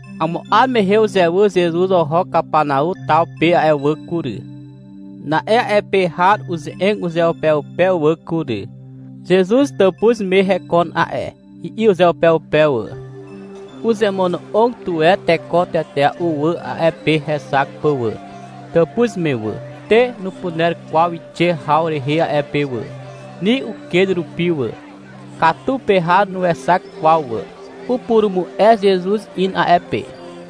Amo 'ar mehe uzewyr Zezuz oho Kapanau taw pe a'e wà kury. Na'e a'e pe har uze'eg uzeupeupe wà kury. — Zezuz tàpuz me hekon a'e, i'i uzeupeupe wà. Uzemono'og tuwe teko tetea'u wà a'e pe hexak pà wà, tàpuz me wà. Te nupuner kwaw wixe haw rehe a'e pe wà, ni uken rupi wà. Katu pe har nuexak kwaw wà. Upurumu'e Zezuz in a'e pe.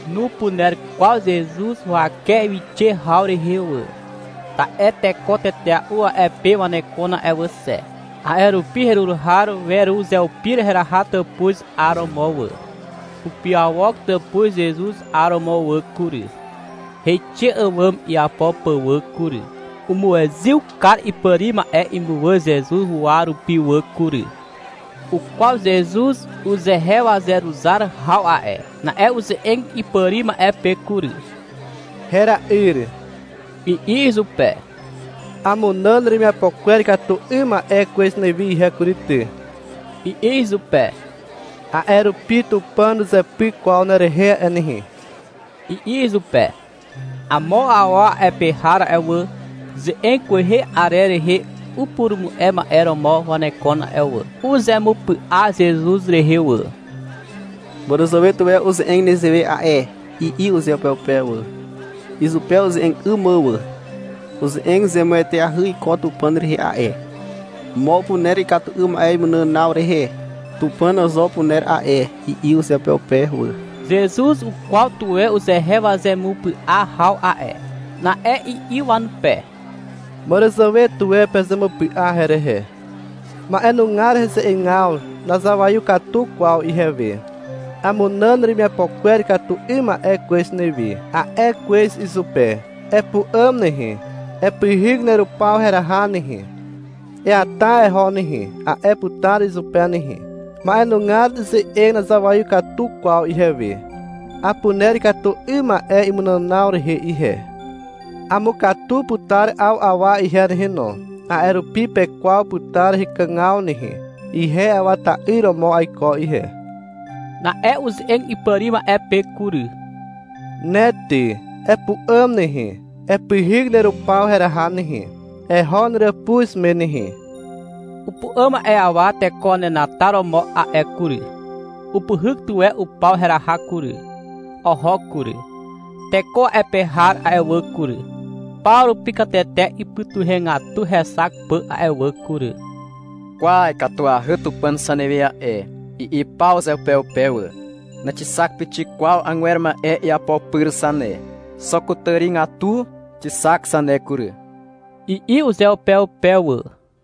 Nupuner kwaw Zezuz huwake wixe haw rehe wà. Ta'e teko tetea'u a'e pe wanekon a'e wà xe. A'e rupi herur har weruzeupir heraha tàpuz 'aromo wà. Upiawok tàpuz Zezuz 'aromo wà kury, heixe àwàm iapo pà wà kury. Umuezyw kar ipàri ma'e imuwà Zezuz huwa rupi wà kury. Ukwaw Zezuz uzehe wazeruzar haw a'e. Na'e uze'eg ipàri ma'e pe kury. — Hera'yr, i'i izupe. — Amunàn neremiapo kwer ikatu 'ym ma'e kwez newi ihe kury ty, i'i izupe. — A'e rupi Tupàn nuzepyk kwaw nerehe a'e nehe, i'i izupe. Amo awa a'e pe har a'e wà, ze'eg kwehe arer rehe upurumu'e ma'e romo wanekon a'e wà. Uzemupy'a Zezuz rehe wà. — Màràzàwe tuwe uze'eg nezewe a'e, i'i uzeupeupe wà, izupe uze'eg 'ym mà wà. — Uze'eg zemueteahy iko Tupàn rehe a'e. Mo upuner ikatu 'ym ma'e imunànaw rehe. Tupàn zo upuner a'e, i'i uzeupeupe wà. Zezuz ukwaw tuwe uzehe wazemupy'a haw a'e. Na'e i'i wanupe. — Màràzàwe tuwe pezemupy'a herehe. Ma'enugar heze'egaw nazawaiw katu kwaw ihewe. — Amunàn neremiapo kwer ikatu 'ym ma'e kwez newi, a'e kwez izupe. — Epu'àm nehe, epyhyk nerupaw heraha nehe, eata eho nehe, a'e putar izupe nehe. Ma'enugar ze'eg nazawaiw katu kwaw ihewe. Apuner ikatu 'ym ma'e imunànaw rehe ihe. Amukatu putar 'aw awa ihe nehe no, a'e rupi pekwaw putar hekàgaw nehe. Ihe Awa ta'yr romo aiko ihe. Na'e uze'eg ipàri ma'e pe kury. — Ne ty, epu'àm nehe, epyhyk nerupaw heraha nehe, eho neràpuz me nehe, i'i izupe. Upu'àm a'e awa teko wanenataromo a'e kury. Upyhyk tuwe upaw heraha kury, oho kury. Teko a'e pe har a'e wà kury, paw rupi katete ipytuhegatu hexak pà a'e wà kury. — Kwa, ikatuahy Tupàn zanewe a'e, i'i paw uzeupeupe wà. — Naxixak pixik kwaw agwer ma'e iapo pyr zane. Xo kutàrigatu e xixak zane kury, i'i uzeupeupe wà.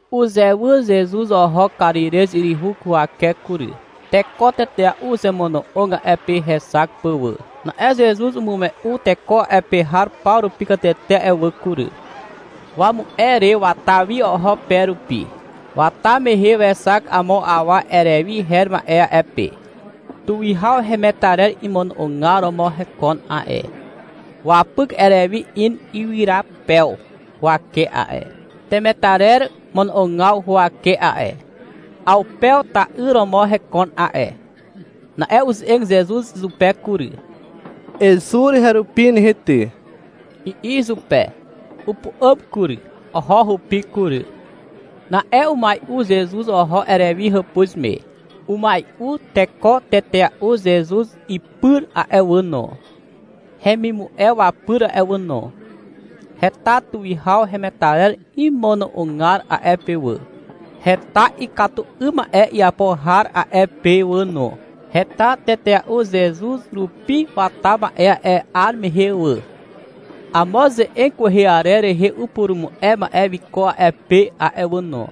Uzewyr Zezuz oho Karirez yryhu huwake kury. Teko tetea'u uzemono'og a'e pe hexak pà wà. Na'e Zezuz umu'e teko a'e pe har paw rupi katete a'e wà kury. Wamu'e re wata wi oho pe rupi. Wata mehe wexak amo awa Erewi her ma'e a'e pe. Tuwihaw hemetarer imono'ogar romo hekon a'e. Wapyk Erewi in ywyrapew huwake a'e, temetarer mono'ogaw huwake a'e. Awpew ta'yr romo hekon a'e. Na'e uze'eg Zezuz izupe: kury. — Ezur herupi nehe ty, i'i izupe. Upu'àm kury, oho hupi kury. Na'e umai'u Zezuz oho Erewi hàpuz me. Umai'u teko tetea'u Zezuz ipyr a'e wà no, hemimu'e wapyr a'e wà no. Heta tuwihaw hemetarer imono'ogar a'e pe wà. Heta ikatu 'ym ma'e iapo har a'e pe wà no. Heta tetea'u Zezuz rupi wata ma'e a'e 'ar mehe wà. Amo ze'eg kwehe arer rehe upurumu'e ma'e wiko a'e pe a'e wà no.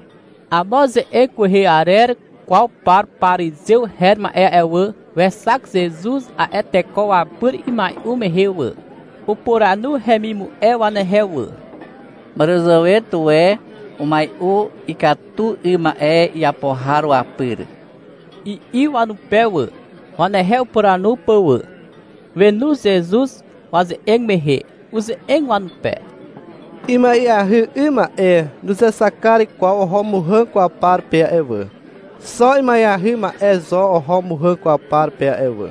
Amo ze'eg kwehe arer kwaw par parizew her ma'e a'e wà, wexak Zezuz a'e teko wapyr imai'u mehe wà. Upuranu hemimu'e wanehe wà. Màràzàwe tuwe umai'u ikatu 'ym ma'e iapo har wapyr, i'i wanupe wà, wanehe upuranu pà wà. Wenu Zezuz waze'eg mehe, uze'eg wanupe. — Ima'eahy 'ym ma'e nuzexak kar kwaw oho muhàg kwaw par pe a'e wà. Xo ima'eahy ma'e zo oho muhàg kwaw par pe wà.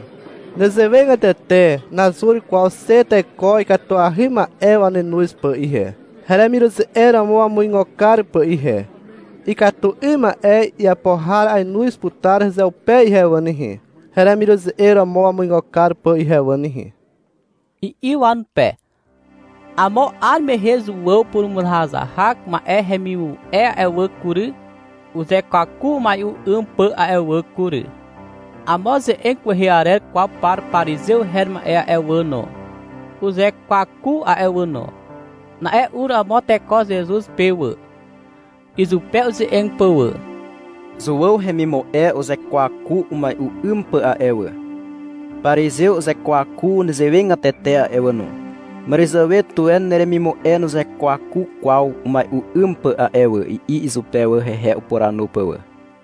Nezewegatete nazur kwaw xe teko ikatuahy ma'e wanenoz pà ihe, heremiruze'eg romo wamuigo kar pà ihe. Ikatu 'ym ma'e iapo har ainoz putar hezeupe ihe wà nehe, heremiruze'eg romo wamuigo kar pà ihe wà nehe, i'i wanupe. Amo 'ar mehe Zuàw purumuzahazahak ma'e hemimu'e a'e wà kury, uzekwaku umai'u 'ym pà a'e wà kury. Amo ze'eg kwehe arer kwaw par parizew her ma'e a'e wà no, uzekwaku a'e wà no. Na'e ur amo teko Zezuz pe wà, izupe uze'eg pà wà. — Zuàw hemimu'e uzekwaku umai'u 'ym pà a'e wà. Parizew uzekwaku nezewegatete a'e wà no. Màràzàwe tuwe neremimu'e nuzekwaku kwaw umai'u 'ym pà a'e wà, i'i izupe wà, hehe upuranu pà wà.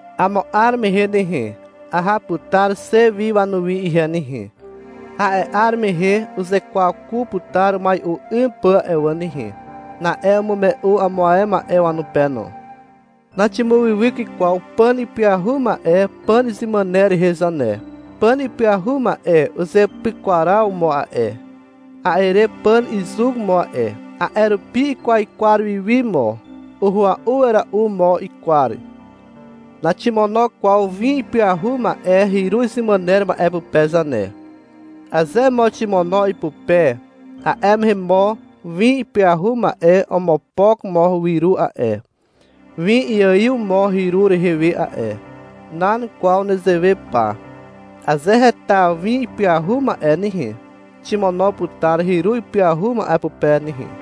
Amo 'ar mehe nehe, aha putar xe wi wanuwi ihe nehe. A'e 'ar mehe uzekwaku putar umai'u 'ym pà a'e wà nehe. Na'e umume'u amo ae ma'e wanupe no. — Naximuwywyk kwaw pàn ipyahu ma'e pàn izemàner rehe zane. Pàn ipyahu ma'e uzeapyakwar mo a'e. A'e re pàn izuk mo a'e. A'e rupi ikwaikwar wiwi mo. Uhua'u wera'u mo ikwar. Naximono kwaw win ipyahu ma'e hyru izemàner ma'e pupe zane. Aze mo ximono ipupe, a'e mehe mo win ipyahu ma'e omopok mo wyru a'e. Win iaiw mo hyru rehe we a'e. Nan kwaw nezewe pa. Aze heta win ipyahu ma'e nehe, ximono putar hyru ipyahu ma'e pupe nehe.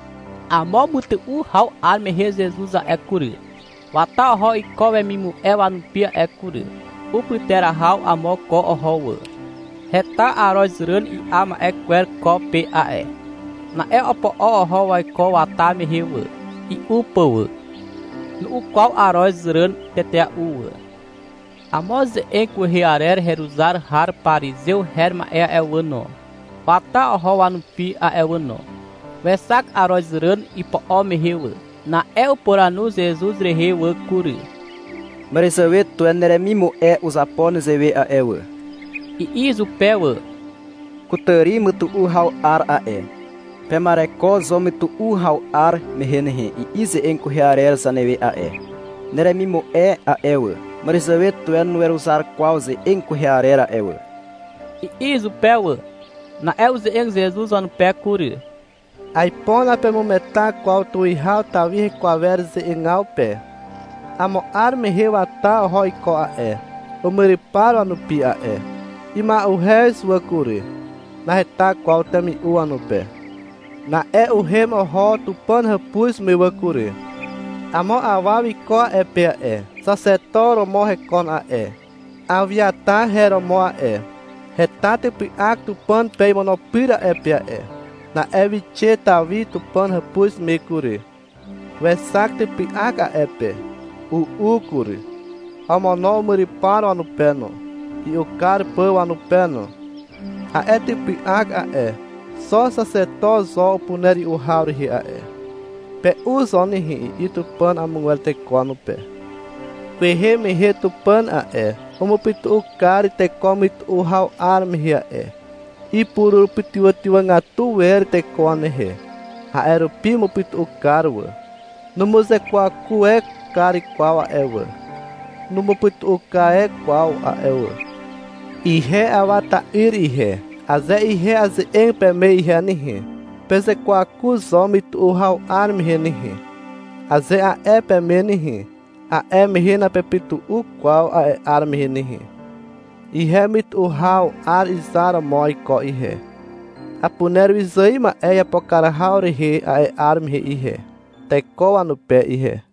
Amo mytu'u haw 'ar mehe Zezuz a'e kury, wata oho iko wemimu'e wanupi a'e kury. Upyterahaw amo ko oho wà. Heta arozràn i'a ma'e kwer ko pe a'e. Na'e opo'o oho waiko wata mehe wà, i'u pà wà. Nu'u kwaw aroz ràn tetea'u wà. Amo ze'eg kwehe arer heruzar har parizew her ma'e a'e wà no, wata oho wanupi a'e wà no. Wexak arozràn ipo'o mehe wà. Na'e upuranu Zezuz rehe wà kury. — Màràzàwe tuwe neremimu'e uzapo nezewe a'e wà, i'i izupe wà. — Kutàri mytu'u haw 'ar a'e. Pema'ereko zo mytu'u haw 'ar mehe nehe, i'i ze'eg kwehe arer zanewe a'e. Neremimu'e a'e wà, màràzàwe tuwe nuweruzar kwaw ze'eg kwehe arer a'e wà, i'i izupe wà. Na'e uze'eg Zezuz wanupe kury. — Aipo napemugeta kwaw Tuwihaw Tawi heko awer rehe ze'egaw pe. Amo 'ar mehe wata oho iko a'e, umyrypar wanupi a'e. Ima'uhez wà kury. Naheta kwaw temi'u wanupe. Na'e uhem oho Tupàn hàpuz me wà kury. Amo awa wiko a'e pe a'e. Xaxeto romo hekon a'e. Awiatar her romo a'e. Heta typy'ak Tupàn pe imono pyrer a'e pe a'e. Na'e wixe Tawi Tupàn hàpuz me kury. Wexak typy'ak a'e pe. U'u kury. Omono umyrypar wanupe no, i'u kar pà wanupe no. A'e typy'ak a'e, xo Xaxeto zo upuner i'u haw rehe a'e. — Pe'u zo nehe, i'i Tupàn amogwer teko wanupe. Kwehe mehe Tupàn a'e, umupytu'u kar teko mytu'u haw 'ar mehe a'e. Ipurupytywàgatu wer teko wanehe. A'e rupi umupytu'u kar wà. Numuzekwaku e kar kwaw a'e wà. Numupytu'u e kar kwaw a'e wà. Ihe Awa ta'yr ihe, aze ihe aze'eg peme ihe nehe, — Pezekwaku zo mytu'u haw 'ar mehe nehe, aze a'e peme nehe, a'e mehe napepytu'u kwaw a'e 'ar mehe nehe. Ihe mytu'u haw 'ar izar romo aiko ihe, apuner wyzài ma'e iapo kar haw rehe a'e 'ar mehe ihe, teko wanupe ihe.